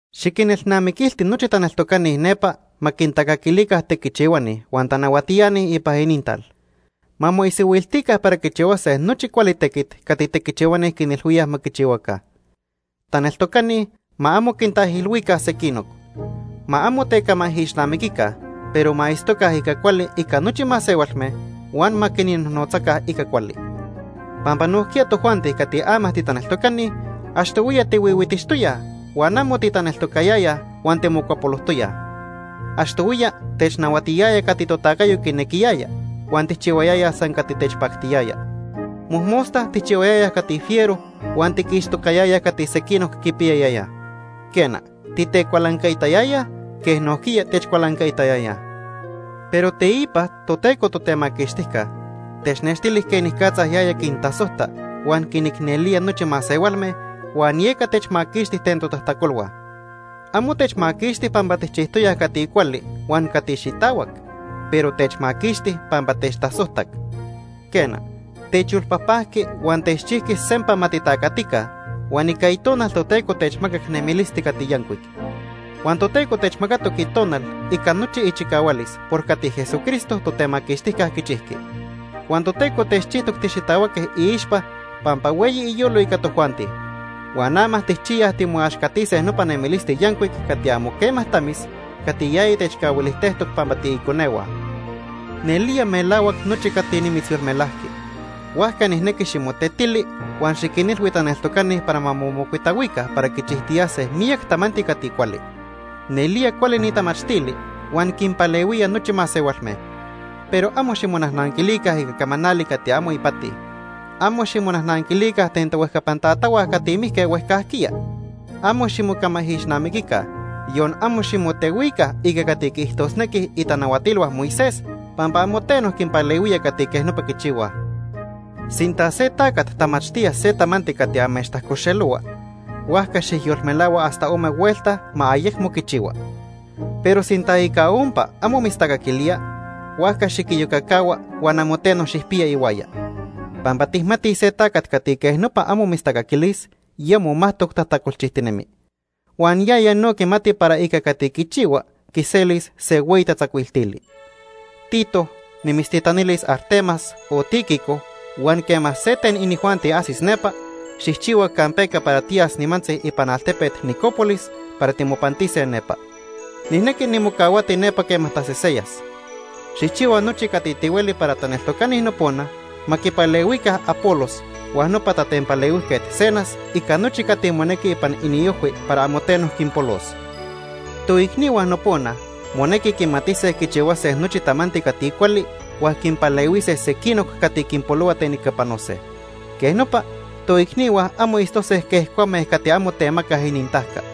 Xiquinelnamiquilti nochi taneltocani nepa ma quintacaquilica tequichihuani huan tanahuatiani ipan inintal. Ma moisihuiltica para quichihuase nochi cuali tequit cati tequichihuani quinilhuíaj ma quichihuaca. Taneltocani ma amo quintaijilhuica sequinoc. Ma amo tecamaijixnamiquica, pero ma itztoca ica cuali ica nochi masehualme huan ma quinnojnotzaca ica cuali. Pampa nojquiya tojuanti cati ama titaneltocani, achtohuiya tihuihuitixtoyaj huan amo titaneltocayayaj, huan timocuapolojtoyaj. Achtohuiya technahuatiyaya cati totacayo quinequiyaya, huan tijchihuayayaj san cati techpactiyaya. Mojmosta tijchihuayayaj cati fiero huan tiquixtocayayaj cati sequinoc quipiyayayaj. Quena, titecualancaitayayaj quej nojquiya techcualancaitayayaj. Pero teipa Toteco Totemaquixtijca technextili quenicatza yaya quintasojta huan quinicnelía nochi masehualme, huan yeca techmaquixti ten totajtacolhua. Amo techmaquixti pampa tijchijtoyaj cati cuali huan cati xitahuac, pero techmaquixti pampa techtasojtac. Quena, techyolpajpajqui huan techchijqui sempa ma titacatica, huan ica Itonal Toteco techmacac nemilisti cati yancuic. Huan Toteco techmacatoc Itonal ica nochi ichicahualis por cati Jesucristo, Totemaquixtijca, quichijqui. Huan Toteco techchijtoc tixitahuaque iixpa pampa hueyi iyolo ica tojuanti. Huan ama tijchiyaj timoaxcatise nopa nemilisti yancuic cati amo quema tamis cati yaya techcahuilijtejtoc pampa tiiconehua. Nelía melahuac nochi cati nimitzyolmelajqui, huajca nijnequi ximotetili huan xiquinilhui taneltocani para ma momocuitahuica para quichijtiyase miyac tamanti cati cuali. Nelía cuali ni tamachtili huan quinpalehuía nochi masehualme. Pero amo ximonajnanquilica ica camanali cati amo ipati. Amo ximonajnanquilica ten tohuejcapan tatahua cati mijque huejcajquiya. Amo ximocamaijixnamiquica, yon amo ximotehuica ica cati quiijtosnequij itanahuatilhua Moisés, pampa amo teno quinpalehuía cati quej nopa quichihuaj. Sinta se tacat tamachtía se tamanti cati amechtajcoxelohua, huajca xijyolmelahua hasta ome huelta ma ayecmo quichihua. Pero sinta ica ompa amo mitztacaquilía, huajca xiquiyocacahua huan amo teno xijpiya ihuaya. Pampa tijmatij se tacat cati quej nopa amo mitztacaquilis, ya momajtoc tajtacolchijtinemi. Huan yaya no quimati para ica cati quichihua quiselis se hueyi tatzacuiltili. Tito, nimitztitanilis Artemas o Tíquico huan quema se ten inijuanti ajsis nepa, xijchihua campeca para tiyas nimantzi ipan altepet Nicópolis para timopantise nepa. Nijnequi nimocahuati nepa quema taseseyas. Xijchihua nochi cati tihueli para taneltocani nopona ma quipalehuica Apolos huan nopa tatempalehuijquet Zenas ica nochi cati monequi ipan iniojhui para amo teno quinpolos. Toicnihua nopona monequi quimatise quichihuase nochi tamanti cati cuali, huan quinpalehuise sequinoc cati quinpolohua ten ica panose. Quej nopa, toicnihua amo itztose quej cuame cati amo temacaj inintajca.